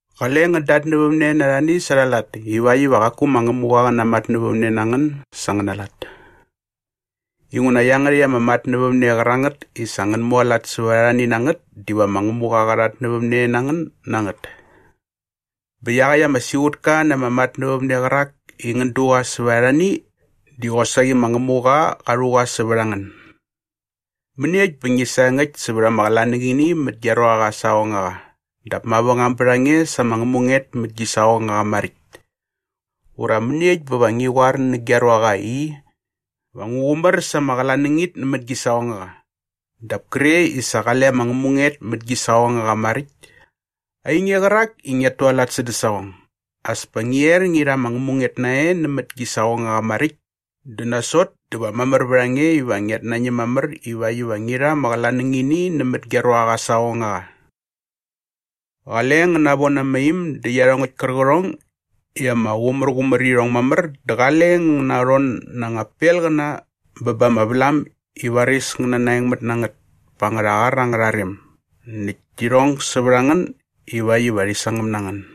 “Qale ngän datnävämne na arhani sa arha lat ivakt iva qaku ma Ngämuqa qä namatnävämne na ngän sa angäna lat. Inguna iangärhäkt ama matnävämne qärangät i sa ngän mualat sävät arhani na ngät diva ma Ngämuqa qa rhatnävämne na ngän na ngät. Bä iaqäkt ama siqutka na ama matnävämne qärak i ngän du qa sävät arhani diva qosaqi ma Ngämuqa qa rhu qa sävät a ngän. “Mäniekt bä ngi saengäkt sävät ama qlanängini mät gia ruaqa aa saqongaqa dap mavängam bät a nge sa ama ngämunget mät gi saqongaqa maräkt? Ura mäniekt bä va ngi qoar nä gia ruaqa i, ‘Va ngu qumär sa ama qlanängini nämät gi saqongaqa’ dap kre i sa qale ama ngämunget mät gi saqongaqa maräkt? Ainge qärak i ngiat tualat sädä saqong, as pa ngi er ngi rha ama ngämunget nae nämät gi saqongaqa maräkt dä nasot dä va mamär vät a nge iva ngiat nañäm mamär ivakt iva ngi rha ama qlanängini nämät gia ruaqa aa saqongaqa. “Qale ngän navon ama im dä iarhongäkt kärqärhong i ama qumärqumär mamär irhong dä qale ngän narhon nä angän pelqäna bä ba ama vlam i varis ngä nanaengmät na ngät pa angärha qar angärha rem näkt ti rhong sävät a ngän ivakt iva rhi sangäm na ngän.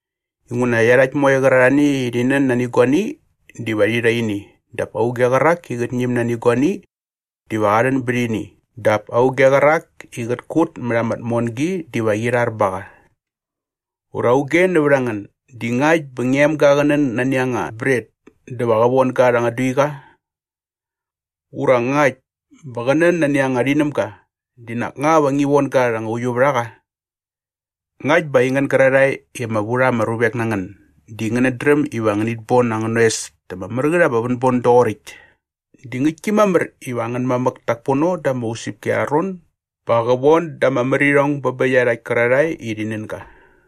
Inguna iarhakt moe qärarhae i rhi nän nani guani diva rhi rha ini dap auge qärak i qät ñäm nani guani diva qa rhän bät ini dap auge qärak i qät kut mät ama tmongi diva qi rhar ba qa. “Ura auge nävät a ngän di ngakt bä ngia emga qä nän nani anga bret dä va qä von ga rha anga duiqa? Ura ngakt bä qä nän nani anga rhinämga di nak nga va ngi von ga rha anga uiuvärhaqa? Ngakt bä aingän gärarhae i ama vu rha ama ruvek na ngän di ngänät dräm iva ngänit bon angän oes ta ama mär ngät ama vänbon doqoräkt di ngäktki mamär iva angän mamäk tak pono da ama usäpki arha ron ba qä von da ama märirhong bä bä iarhakt kärarhae i rhi nän ga!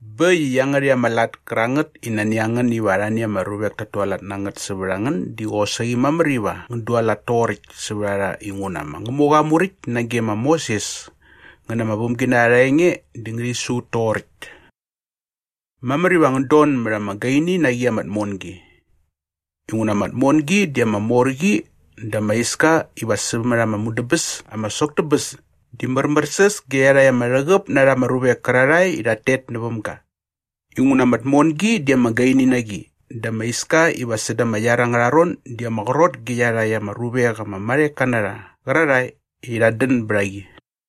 “Bä äkt i iangärhäkt ama lat kärangät i nani a ngän iva arhani ama ruvek tat tualat na ngät sävät a ngän di qosaqi mamär iva ngän dualat toqoräkt sävät a rha inguna ma Ngämuqa aa Muräkt nage ma Moses ngä na aa vämginarha arha enge di ngärhi su ut toqoräkt. “Mamär iva ngän don mät ama gaini na qi ama tmongi. Inguna ama tmongi di ama mor qi dä ama iska iva sämät ama mudäbäs ama sok tä bäs di märmärsäs ge iarhakt ama rhäqäp na rha ama ruvek kärarhae i rhat tet näväm ga. Inguna ama tmongi di ama gaini na qi dä ama iska iva säda ama iar angärha ron di ama qrot ge iarhakt ama ruvek ama marheka na rha qärarhae i rhat dän bät a qi.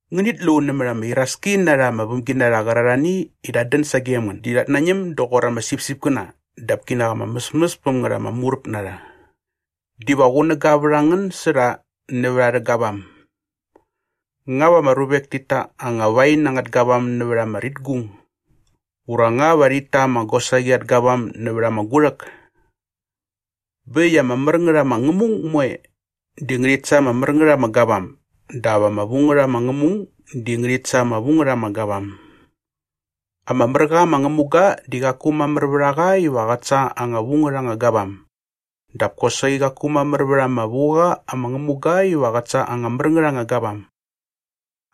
“Ngänit lu nämät ama iraski na rha ama vämginarha qärarhani i rhat dän sagem ngän di rhat nañäm doqor ama sipsipkäna dap kinak ama mäsmäs päm ngät ama muräp na rha. Diva qunäga vät a ngän sä rha nävät arhä gavam. Nga va ama ruvek tit ta anga wain angät gavam nävät ama ritgung? Ura nga va rhit ta anga gosaqi at gavam nävät ama gurhäk? Bä äkt i ama mär ngät ama ngämung moe di ngärhit sa ama mär ngät ama gavam dap ama vu ngät ama ngämung di ngärhit sa ama vu ngät ama gavam. Ama mär qa ama ngämuga di qaku mamär vät a qa iva qät sa anga vu ngät anga gavam dap kosaqi qaku mamär vät ama vu qa ama ngämuga iva qät sa anga mär ngät anga gavam.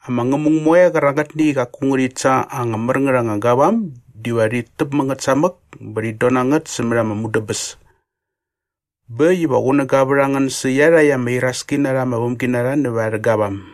Ama ngämung moe qärangätni i qaku ngärhit sa anga mär ngät anga gavam diva rhit täp mä ngät samäk bä rhit don na ngät sämät ama mudäbäs. Bä äkt iva qunäga vät a ngän sä iarhakt ama iraski na rha ama vämginarha nävät arhä gavam.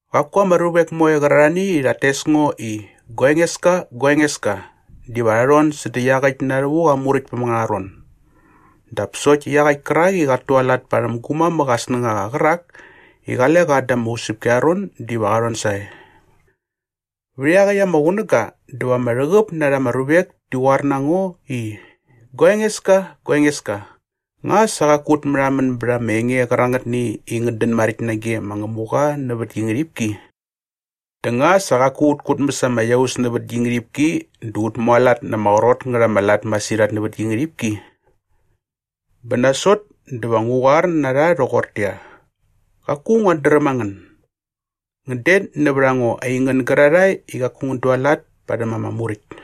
“Qaku ama ruvek moe qärarhani i rhat tes ngo i ‘Gua Engeska, gua Engeska’ diva rha rhon sädä iaqäkt na rhävuk aa Muräktpäm angärha ron dap sokt iaqäkt kärak i qat tualat parhäm gu mamäk aa snängaqa qärak i qale qa da ama usäpki arha ron diva qa rhon sae. Vät iaqäkt ama qunäga dä va ama rhäqäp na rha ama ruvek ti qoar na ngo i, ‘Gua Engeska, gua Engeska, nga qaku sa ut märhamän bät ama enge qärangätni i ngät dän maräkt nage ma Ngämuqa nävät gi ngärhipki? Dä nga qaku sa ut kutmäs ama iaus nävät gi ngärhipki dä ut mualat na ama qrot ngät ama lat masirhat nävät gi ngärhipki?’ Bä nasot dä va ngu qoar na rha rhoqortäqyia, ‘Qaku nguat dräm a ngän. Ngän det nävät a ngo aingän gärarhae i qaku ngän dualat parhäm ama muräkt.’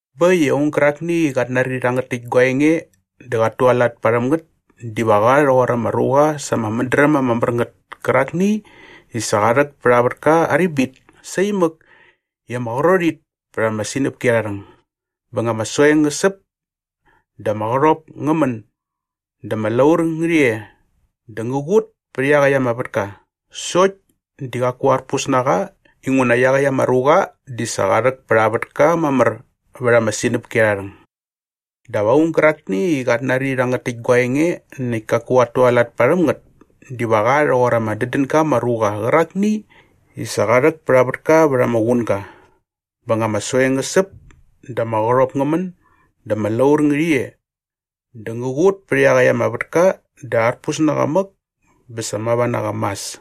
“Bä äkt i aung gärakni i qat nari rhangät täkt gua enge dä qat tualat parhäm ngät diva qa rhoqor ama ruqa sa ama mädräm ama mär ngät kärakni i sa qa rhäk pät aa vätka aa ribit saimäk i ama qrot it pät ama sinäpki arha rhäng. Bä nga ama soeng ngä säp dä ama qärhop ngä män dä ama laur ngärhi e dä ngä qut pät iaqäkt ama vätka sokt di qaku arpus na qa inguna iaqäkt ama ruqa di sa qa rhäk pät aa vätka mamär vät ama sinäpki arha rhäng. “Dap aung gärakni i qat nari rhangät täkt gua enge näkt kaku qat tualat parhäm ngät diva qa rhoqor ama dädän ga ama ruqa qärakni i sa qa rhäk pät aa vätka vät ama qunga. Bä nga ama soeng ngä säp dä ama qärhop ngä män dä ama laur ngärhi e dä ngä qut pät iaqäkt ama vätka dä arpus nä qa mäk bä sa mava na qa mas.”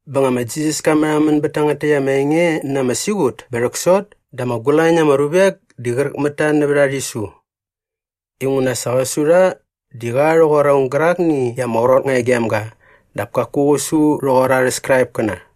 Bä nga ma Jisas ka märhamän bät tangät täkt ama enge na ama siqut bä rhäksot dä ama gulañ na ama ruvek di qräk mät ta nävät aa rhisu inguna sa qä su rha di qa rhoqor aung gärakni i ama qrot nga e gem ga dap kaku qä su rhoqor arhä Skraipkäna.